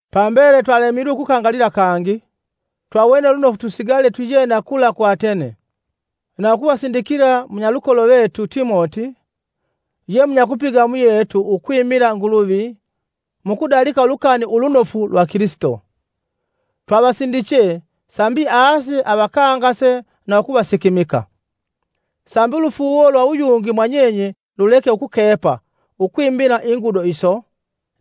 Pambele twalemilwe ukukangalila kangi, twawene lunofu tusigale twiyena kula ku Atene, na ukuvasindikila munyalukolo vetu Timoti, ye munyakupiga muyetu ukwimila Nguluvi mu kudalika Ulukani Ulunofu lwa Kilisito. Twavasindiche sambi ase avakangase na ukuvasikimika, sambi ulufuuwo lwa uyungi mwa nyenye luleke ukukepa ukwimila ingudo iso.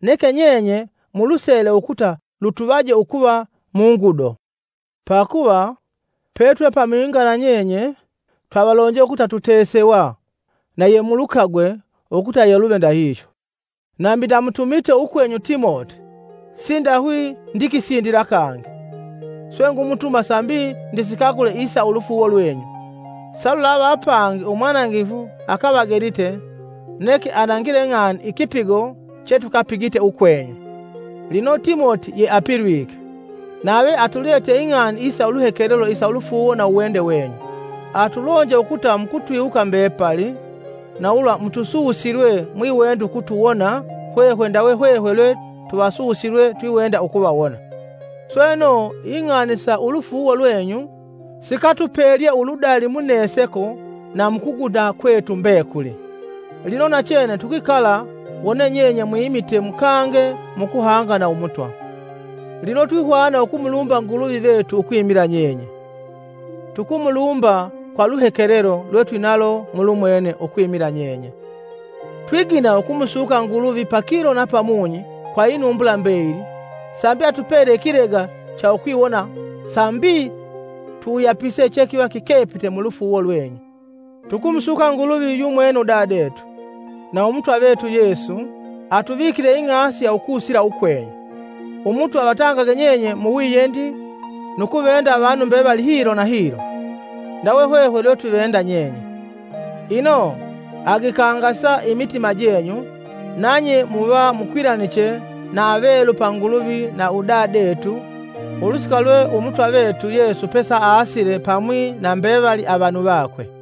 Neke nyenye mulusele ukuta lutuvaje ukuva mu ngudo. Pakuva, pe twe pamwinga na nyenye, twavalonje ukuta tutesewa, na yemulukagwe, ukuta yeluve ndahihyo. Nambi ndamutumite ukwenyu Timoti. Sindahwi ndikisindila kangi, swe ngumutuma sambi ndisikagule isa ulufuuwo lwenyu. Salulava apangi umwanangifu akavagelite neke anangileng'ani ikipigo chetukapigite ukwenyu. Lino Timoti yeapilwike, nave atuletye ing'ani isa uluhekelelo isa ulufuuwo na uwende wenyu. Atulonje ukuta mukutwiwuka mbepali, na ulwa mutususilwe mwiwenda ukutuwona hwehwe ndawe hwehwe lwe tuvasusilwe twiwenda ukuvawona. Sweno ing'ani sa ulufuuwo lwenyu sikatupelye uludali mu neseko na mu kuguda kwetu mbekuli, lino nachene tukwikala wone nyenye mwimite mukange mu kuhanga na Umutwa. Lino twihwana ukumulumba Nguluvi vetu ukwimila nyenye. Tukumulumba kwa luhekelelo lwetwinalo mulumwene ukwimila nyenye. Twigina ukumusuka Nguluvi pakilo na pamunyi kwa inumbula mbeyili sambi atupele ikilega cha ukwiwona sambi tuwuyapise chekiva kikepite mu lufuuwo lwenyu. Tukumusuka Nguluvi yumwene udadetu, na Umutwa vetu Yesu atuvikile ing'asi ya ukusila ukwenyu. Umutwa avatangage nyenye muwiyendi nu kuvenda avanu mbevali hilo na hilo, ndawe hwehwe lwe tuvenda nyenye. Ino agikangasa imitima jenyu, nanye muva mukwilaniche na avelu pa Nguluvi na udadetu ulusika lwe Umutwa vetu Yesu pesaasile pamwi na mbevali ve vanu vakwe.